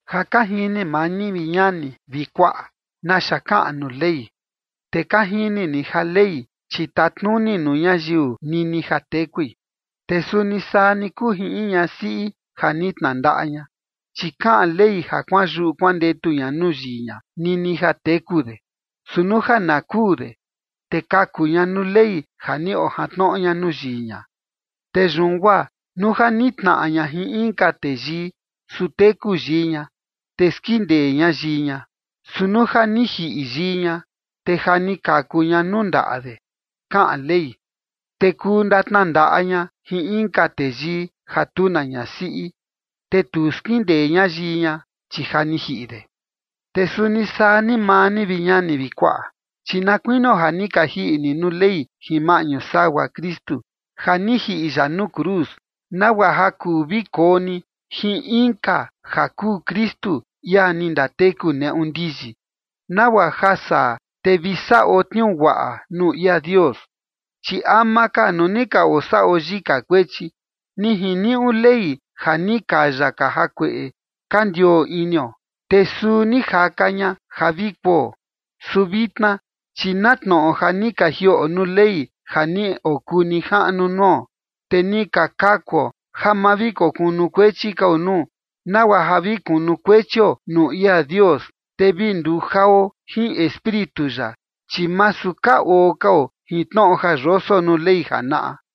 Ja ka jini maa ni, vi ñani vi kuaꞌa, naxa kaꞌan nuu Ley, te ka jini ni ja Ley, chi tatnuni nuu ñayiu nini ja tekui. Te suni saa ni kuu jin in ñasiꞌi ja ni tnandaꞌa ña, chi kaꞌan ley ja kuanyuꞌu kuandetu ña nuu yii ña nini ja teku de. Su nuu ja na kuu de, te kaku ña nuu ley ja ni ojantnoꞌo ña nuu yii ña. Te yun guaa nuu ja nitnaꞌa ña jin inka teyii, su teku yii ña, te skindee ña yii ña. Su nuu ja ni jiꞌi yii ña, te ja ni kaku ña nuu ndaꞌa de, kaꞌan ley, te kuu ndatnandaꞌa ña jin inka teyii ja tu na ñasiꞌi, te tu skindee ña yii ña, chi ja ni jiꞌi de. Te suni saa ni maa ni, vi ñani vi kuaꞌa, chi na kuinio ja ni ka jiꞌi ni nuu Ley jin maꞌñu sagua Kristu, ja ni jiꞌi ya nuu cruz, nagua ja kuu vi koo ni jin inka ja kuu Kristu, ia ni ndateku neꞌu ndiyi, nagua ja saa te vi saꞌo tniuu guaꞌa nuu ia Dios. Chi ama ka, nuu ni ka osaꞌo yika kuechi, ni jiniuꞌu Ley ja ni kaya ka jakueꞌe ka ndioo inio, te suu ni jaka ña ja vi kuo. Su vitna chi na tnoꞌo ja ni ka jiꞌo nuu Ley ja ni okuu nijaꞌnu nuo, te ni ka kakuo ja ma vi kunukuechi kao nuu, nagua ja vi kunukuechio nuu ia Dios, te vi nduo jao jin Espíritu ya, chi masu ka oo kao jin tnoꞌo ja yoso nuu Ley janaꞌa.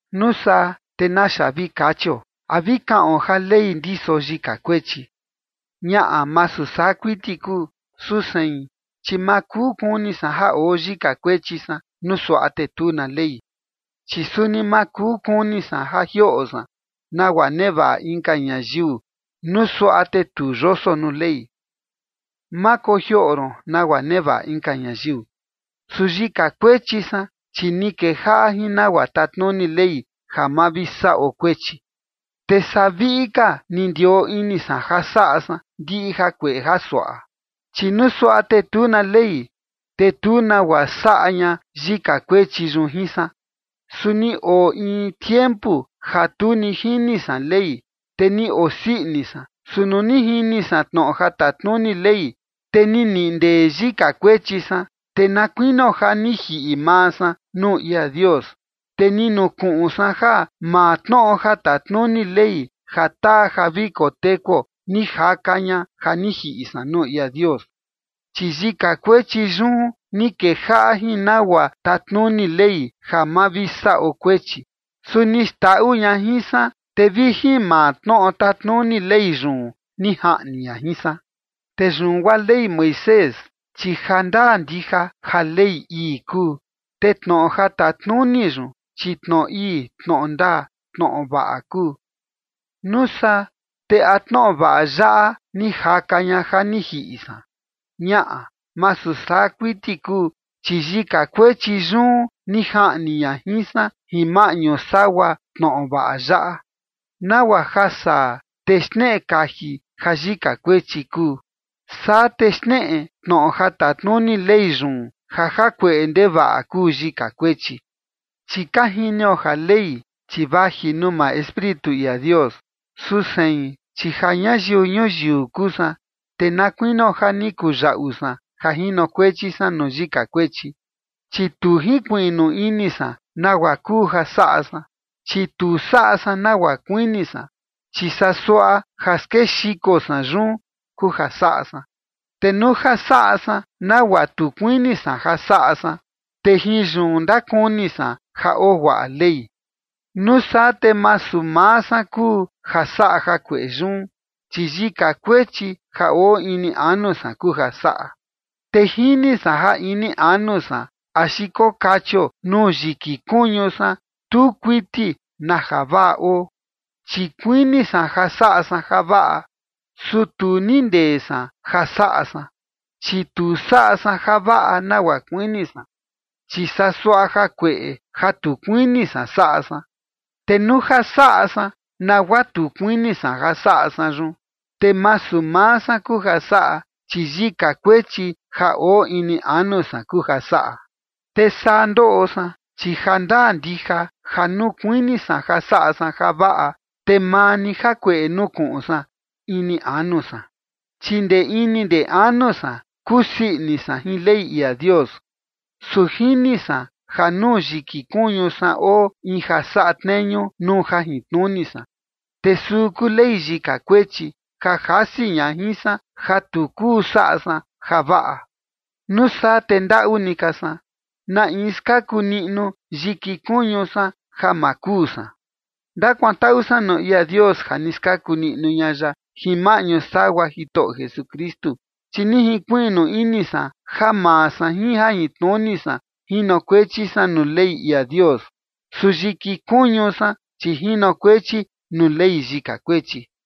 Nuu saa, ¿te naxa vi kachio? ¿A vi kaꞌon ja Ley ndiso yika kuechi? Ñaꞌa, masu saa kuiti kuu. Su sein, chi ma kuu kuni san ja oo yika kuechi san nuu suaꞌa te tu na Ley, chi suni ma kuu kuni san ja jioꞌo san nagua nevaꞌa inka ñayiu, nuu suaꞌa te tu yoso nuu Ley: “Ma kojioꞌo ron nagua nevaꞌa inka ñayiu”. Su yika kuechi san, chi ni kejaꞌa jin nagua tatnuni Ley ja ma vi saꞌo kuechi, te saa viꞌi ka ni ndioo ini san ja saꞌa san ndiꞌi jakueꞌe jasuaꞌa. Chi nuu suaꞌa te tu na Ley, te tu nagua saꞌa ña yika kuechi yun jin san. Su ni oo in tiempu ja tu ni jini san Ley, te ni osii ini san. Su nuu ni jini san tnoꞌo ja tatnuni Ley, te ni niꞌi ndee yika kuechi san, te na kuinio ja ni jiꞌi maa san nuu ia Dios. Te ni nukuꞌun san ja maa tnoꞌo ja tatnuni Ley ja taa ja vi kotekuo, ni jaka ña ja ni jiꞌi san nuu ia Dios. Chi yika kuechi yun ni kejaꞌa jin nagua tatnuni Ley ja ma vi saꞌo kuechi, su ni xndaꞌu ña jin san, te vi jin maa tnoꞌo tatnuni Ley yun ni jaꞌni ña jin san. Te yun guaa Ley Moisés, chi jandaa ndija ja Ley ii kuu. Te tnoꞌo ja tatnuni yun, chi tnoꞌo ii, tnoꞌo ndaa, tnoꞌo vaꞌa kuu. Nuu saa, ¿te a tnoꞌo vaꞌa yaꞌa ni jaka ña ja ni jiꞌi san? Ñaꞌa, masu saa kuiti kuu. Chi yika kuechi yun ni jaꞌni ña jin san jin maꞌñu sagua tnoꞌo vaꞌa yaꞌa, nagua ja saa te xneꞌe kaji ja yika kuechi kuu. Saa te xneꞌe tnoꞌo ja tatnuni Ley yun ja jakueꞌe ndevaꞌa kuu yika kuechi. Chi ka jinio ja Ley, chi vaji nuu maa Espíritu ia Dios. Su sein, chi ja ñayiu ñuyiu kuu san, te na kuinio ja ni kuyaꞌu san ja jinokuechi san nuu yika kuechi. Chi tu jinkuiꞌnu ini san nagua kuu ja saꞌa san, chi tu saꞌa san nagua kuini san, chi saa suaꞌa ja skexiko san yun kuu ja saꞌa san. Te nuu ja saꞌa san nagua tu kuini san ja saꞌa san, te jin yun ndakuni san ja oo guaꞌa Ley. Nuu saa te masu maa san kuu ja saꞌa jakueꞌe yun, chi yika kuechi ja oo ini anu san kuu ja saꞌa. Te jini san ja ini anu san axi kokachio nuu yiki kuñu san, tu kuiti na javaꞌa oo, chi kuini san ja saꞌa san javaꞌa, su tu nindee san ja saꞌa san. Chi tu saꞌa san javaꞌa nagua kuini san, chi saa suaꞌa jakueꞌe ja tu kuini san saꞌa san. Te nuu ja saꞌa san nagua tu kuini san ja saꞌa san yun, te masu maa san kuu ja saꞌa, chi yika kuechi ja oo ini anu san kuu ja saꞌa. Te saa ndoꞌo san, chi jandaa ndija ja nuu kuini san ja saꞌa san javaꞌa, te maa ni jakueꞌe nukuꞌun san ini anu san. Chi ndee ini ndee anu san kusii ini san jin Ley ia Dios. Su jini san ja nuu yiki kuñu san oo in ja saꞌa tneñu nuu jajintnuni san, te suu kuu ley yika kuechi, ja jasi ña jin san ja tu kuu saꞌa san javaꞌa. Nuu saa te ndaꞌu ni ka san. ¿Na in skaku niꞌnu yiki kuñu san ja ma kuu san? Ndakuantaꞌu san nuu ia Dios ja ni skaku niꞌnu ña ya jin maꞌñu sagua Jitoꞌo Jesukristu. Chi ni jinkuiꞌnu ini san ja maa san jin jajintnuni san jinokuechi san nuu Ley ia Dios, su yiki kuñu san, chi jinokuechi nuu ley yika kuechi.